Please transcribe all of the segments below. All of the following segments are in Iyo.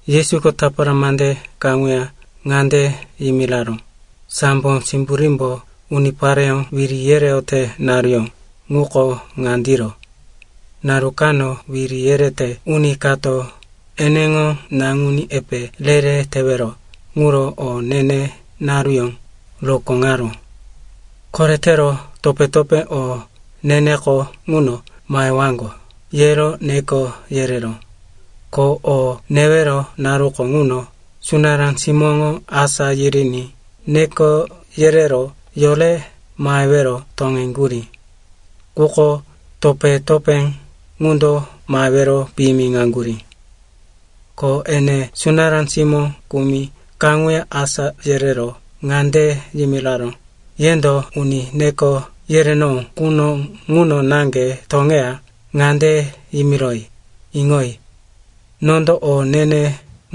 Yesuko tapara mande kaŋuya ŋande yimiraró, “Sambo simburímbo unipareyó wiri yereyote naruyó ŋuko ŋandiro. Naru kano wiri yerete uni kato eneŋo naŋuní epe re-re tewero ŋuro o ne-ne naruyó rokóŋaró. Koretero topé-topé o ne-neko ŋuno mahewaŋgo, yero neko yereró. Ko o newero naruko ŋuno sunará simóŋo asá yiriní neko yerero yore mahewero toŋeŋgurí. Quko topé-topé ŋundo mahewero piyimiŋaŋgurí. “Ko ene sunará simó kumi kaŋuya asá yerero ŋande yimiraró, ‘Yendo uni neko yerenowó quno ŋuno naŋge toŋeya ŋande yimiroyi, “Iŋoyi. Nondo o ne-ne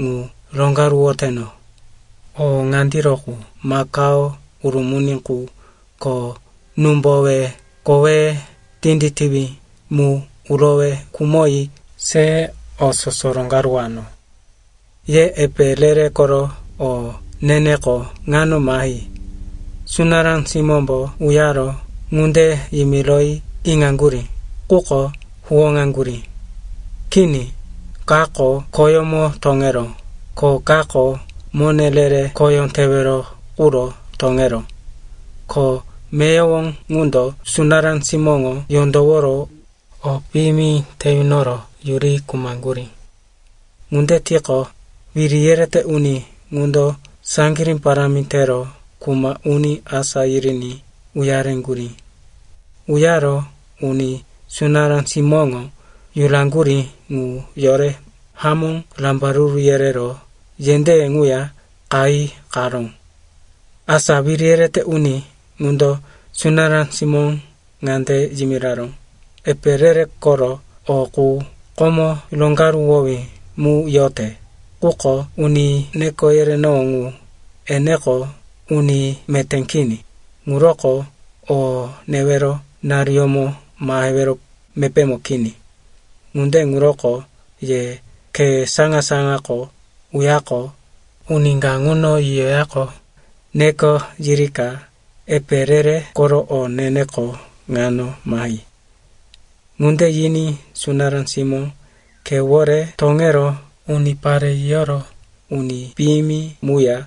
ŋu roŋgaruwoteno. O ŋandiro qu makao urumuni qu ko númbowe koweye tinditiwí mu urowe khumoyi se o soso roŋgaruwano. Ye epe re-re koro o ne-neko ŋano mahi.”’” “Sunará simómbo uyaro ŋunde yimiroyi iŋaŋgurí, quko huwóŋaŋgurí. Kini, kako khoyómo toŋeró, ko kako mone re-re khoyó tewero quro toŋeró. Ko meyowo ŋundo sunará simóŋo yondoworo o piyimi te yunoro yuri khumaŋgurí. Ŋunde tiqo, wiri yerete uni ŋundo saŋgirí parámi tero kuma uni asá yiriní uyareŋgurí. Uyaro uni sunará simóŋo yuraŋgurí ŋu yore hamó rambaruru yerero yendéye ŋuya qayi qaró. “Asa wiri yerete uni ŋundo sunará simóŋo ŋande yimiraró, ‘Epe re-re koro o qu komo roŋgaruwowí mu yote, quko uni neko yerenowó ŋu, eneko uni meté kini, ŋuroko o newero naruyómo mahewero mepémo kini. Ŋunde ŋuroko ye khe saŋa-saŋako uyaqo, uni ka ŋuno yiyoyaqo, neko yirika epe re-re koro o ne-neko ŋano mahi.’ Ŋunde yiní sunará simó khewore toŋero unipare yiyoro uni piyimi muya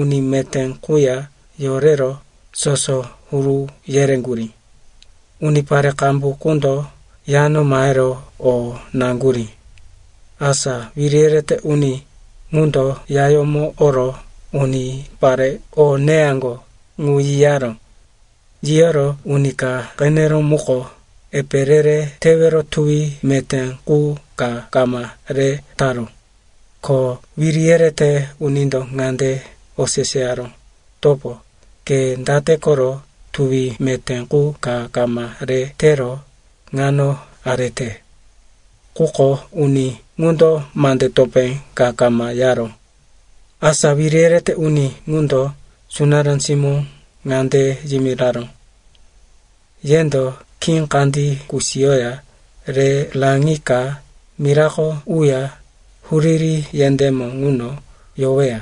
uni meté quya yorero soso huru yereŋgurí. Unipare qambu qundo yano mahero o naŋgurí. “Asa wiri yerete uni ŋundo yayómo oro unipare o neyaŋgo ŋu yiyaró. Yiyoro uni ka qeneró muko epe re-re tewero tuwi meté qu ka kama re taró. Ko wiri yerete unindo ŋande oseseyaró, ‘Topo, ke date koro tuwi meté qu ka kama re tero ŋano arete?’ Quko uni ŋundo mande topé ka kama yaró. “Asa wiri yerete uni ŋundo sunará simó ŋande yimiraró, ‘Yendo khí kandí kusiyoya re raŋika mirako uya huriri yendémo ŋuno yoweya.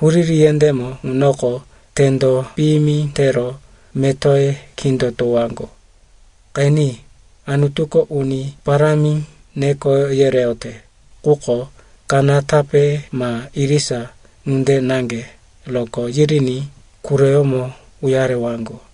Huriri yendémo ŋunoko tendo piyimi tero metoye kindotowaŋgo.’ “Qeni, Anutuko uni parámi neko yereyote, quko kanatape ma irisa ŋunde naŋge rokó yiriní quroyómo uyarewaŋgo.”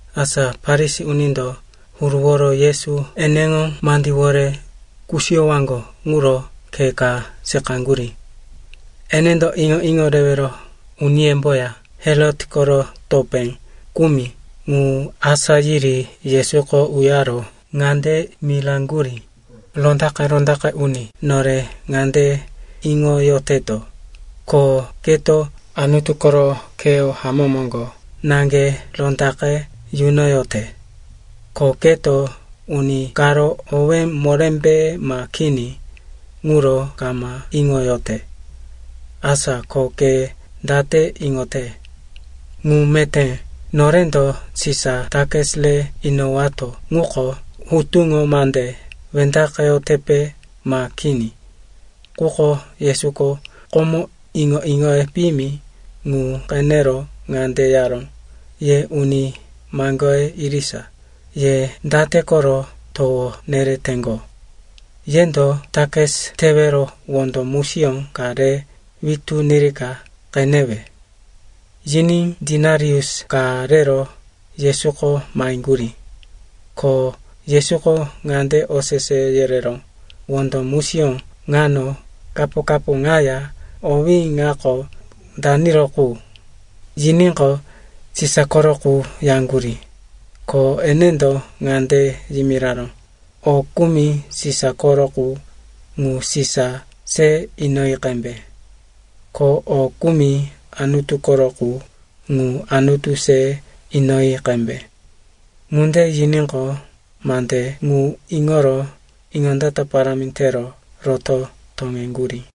Asa Farisi unindo huruworo Yesu eneŋo mandíwore kusiyowaŋgo ŋuro khe ka seqaŋgurí. Enendo iŋo-iŋo rewero uniyemboya Herot koro topé kumi ŋu asá yiri Yesuko uyaro ŋande miraŋgurí, “Rondaqe-rondaqe uni, nore ŋande iŋoyoteto, ko keto Anutu koro kheyó hamó moŋgo naŋge rondaqe yunoyote. Ko keto uni karo owé morémbe ma kini ŋuro kama iŋoyote. Asa ko ke date iŋote? Ŋu meté norendo Sisa takis re inowato ŋuko hutuŋo mande wendaqeyotepe, ma kini?” Quko Yesuko komo iŋo-iŋoye piyimi ŋu qenero ŋande yaró, “Ye uni maŋgoye irisa, ye date koro towo nereteŋgo? Yendo takis tewero wondo musiyó ka re witú nirika qenewe.” Yiní denarius ka rero Yesuko maheŋgurí. Ko Yesuko ŋande osese yereró, “Wondo musiyó ŋano kapo-kapo ŋaya owí ŋako daniro qu?” Yiníqo, “Sisa koro qu,” yaŋgurí. Ko enendo ŋande yimiraró, “O kumi Sisa koro qu, ŋu Sisa se inoyi qembe. Ko o kumi Anutu koro qu, ŋu Anutu se inoyi qembe.” Ŋunde yiníqo, mande ŋu iŋoro iŋondata parámi tero roto toŋeŋgurí.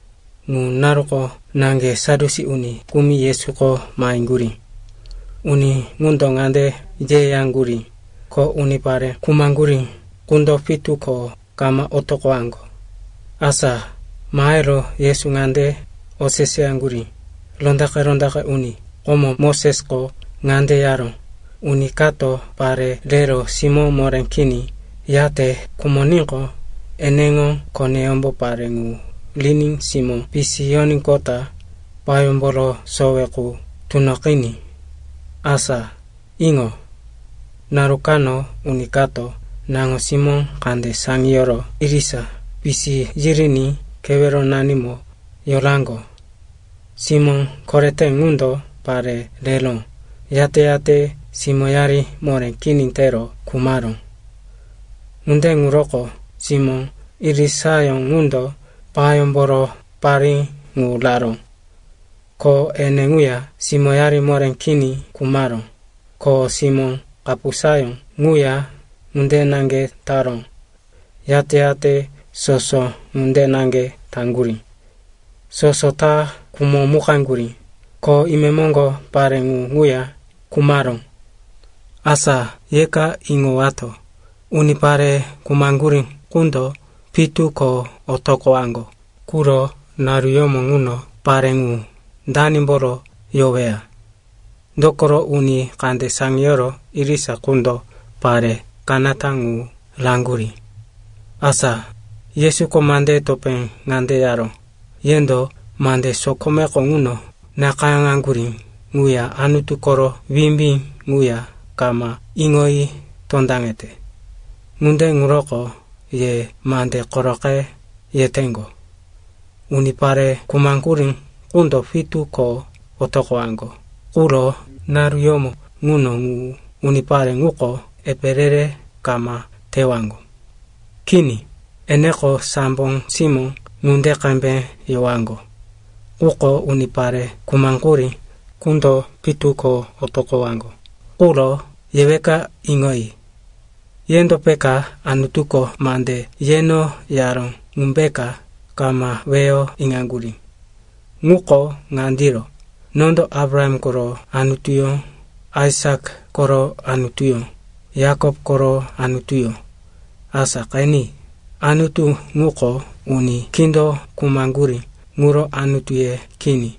Ŋu naruko naŋge Sadyusi uni kumi Yesuko maheŋgurí. Uni ŋundo ŋande yeyaŋgurí, ko unipare khumaŋgurí qundo pitu ko kama otoqowaŋgo. Asa mahero Yesu ŋande oseseyaŋgurí, “Rondaqe-rondaqe uni, komo Mosesko ŋande yaró, ‘Uni kato pare rero simó moré kini yate khumoníqo, eneŋo koneyómbo pare ŋu riní simó pisiyoníqota payómboro sowe qu tunoqiní.’ Asa iŋo. Naru kano uni kato naŋo-simó kande saŋiyoro irisa pisi yiriní keweronanimo yoraŋgo. Simó korete ŋundo pare rero, yate-yate simóyari moré kini tero khumaró. Ŋunde ŋuroko simó irisayó ŋundo payómboro parí ŋu raró. Ko ene ŋuya simóyari moré kini khumaró, ko simó kapusayó ŋuya ŋunde naŋge taró. Yate-yate soso ŋunde naŋge taŋgurí. Soso ta khumomukaŋgurí, ko imemoŋgo pare ŋu ŋuya khumaró. Asa yeka iŋowato, unipare khumaŋgurí qundo pitu ko otoqowaŋgo quro naruyómo ŋuno, pare ŋu, danimboro yoweya? Dokoro uni kande saŋiyoro irisa qundo pare kanata ŋu raŋgurí.” Asa Yesuko mandeye topé ŋande yaró, “Yendo mande sokomeko ŋuno nakayáŋaŋgurí ŋuya Anutu koro wimbí ŋuya kama iŋoyi tondaŋete. Ŋunde ŋuroko ye mande koroqe yeteŋgo. Unipare khumaŋgurí qundo pitu ko otoqowaŋgo quro naruyómo ŋuno ŋu unipare ŋuko epe re-re kama tewaŋgo. Kini, eneko sambo simó ŋunde qembe yowaŋgo. Quko unipare khumaŋgurí qundo pitu ko otoqowaŋgo quro yeweka iŋoyi. Yendo peka Anutuko mande yeno yaró ŋumbeka kama weyo iŋaŋgurí? Ŋuko ŋandiro, ‘Nondo Abraham koro Anutuyó, Aisak koro Anutuyó, Yakop koro Anutuyó.’ Asa qeni, Anutu ŋuko uni kindo khumaŋgurí ŋuro Anutuye kini.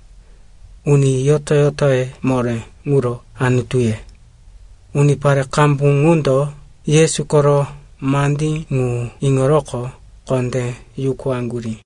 Uni yoto-yotoye moré ŋuro Anutuye.” Unipare qambu ŋundo Yesu koro mandí ŋu iŋoroqo kondé yukuwaŋgurí.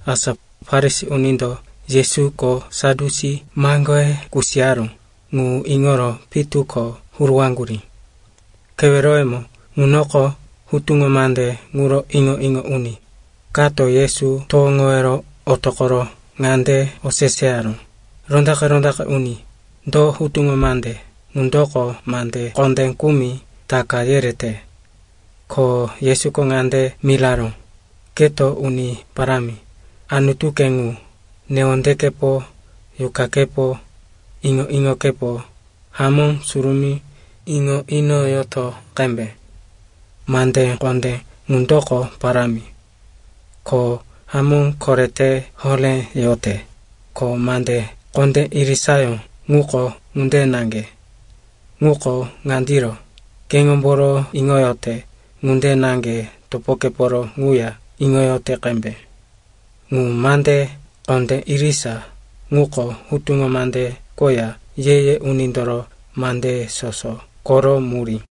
Asa Farisi unindo Yesuko Sadyusi maŋgoye kusiyaró ŋu iŋoro pitu ko huruwaŋgurí. Keweroyemo ŋunoko hutuŋo mande ŋuro iŋo-iŋo uni kato Yesu towoŋowero otoqoro ŋande oseseyaró, “Rondaqe-rondaqe uni, do hutuŋo mande ŋundoko mande kondé kumi taka yerete?” Ko Yesuko ŋande miraró, “‘Keto Uni Parámi, Anutuke ŋu, newondekepo, yuqakepo, iŋo-iŋokepo hamó surumí iŋo inoyoto qembe.’ Mande kondé ŋundoko parámi, ko hamó korete horé yote. Ko mande kondé irisayó ŋuko ŋunde naŋge. Ŋuko ŋandiro, ‘Keŋomboro iŋoyote ŋunde naŋge topokeporo ŋuya iŋoyoto qembe.’ Ŋu mande kondé irisa ŋuko Hutuŋo Mande koya Ye-ye Unindoro mandeye soso koro murí.”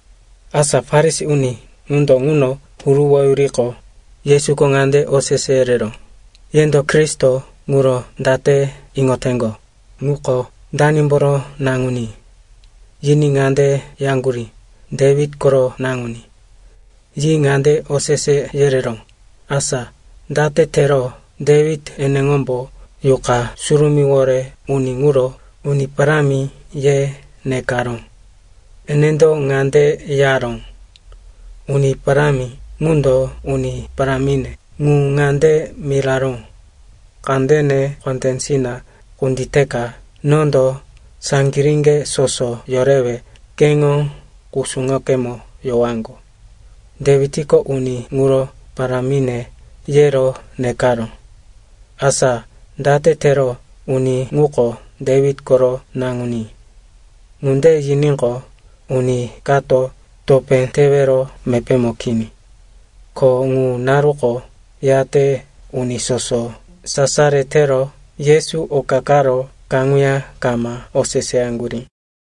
Asa Farisi uni ŋundo ŋuno huruwoyuriqo, Yesuko ŋande osese yereró, “Yendo Kristo ŋuro date iŋoteŋgo, ŋuko danimboro naŋuní?” Yiní ŋande yaŋgurí, “Dewit koro naŋuní.” Yi ŋande osese yereró, “Asa date tero Dewit eneŋombo Yuqa Surumíwore uni ŋuro ‘Uni Parámi,’ ye nekaró? Enendo ŋande yaró, “‘Uni Parámi ŋundo uni parámine ŋu ŋande miraró, “Kandene kondésina kunditeka nondo saŋgiríŋge soso yorewe keŋo kusuŋokemo yowaŋgo.”’ Dewitko uni ŋuro ‘Parámine,’ yero nekaró. Asa date tero uni ŋuko Dewit koro naŋuní?” Ŋunde yiníqo, uni kato topé tewero mepémo kini. Ko ŋu naruko yate uni soso sasaro tero Yesu oka karo kaŋuya kama oseseyaŋgurí.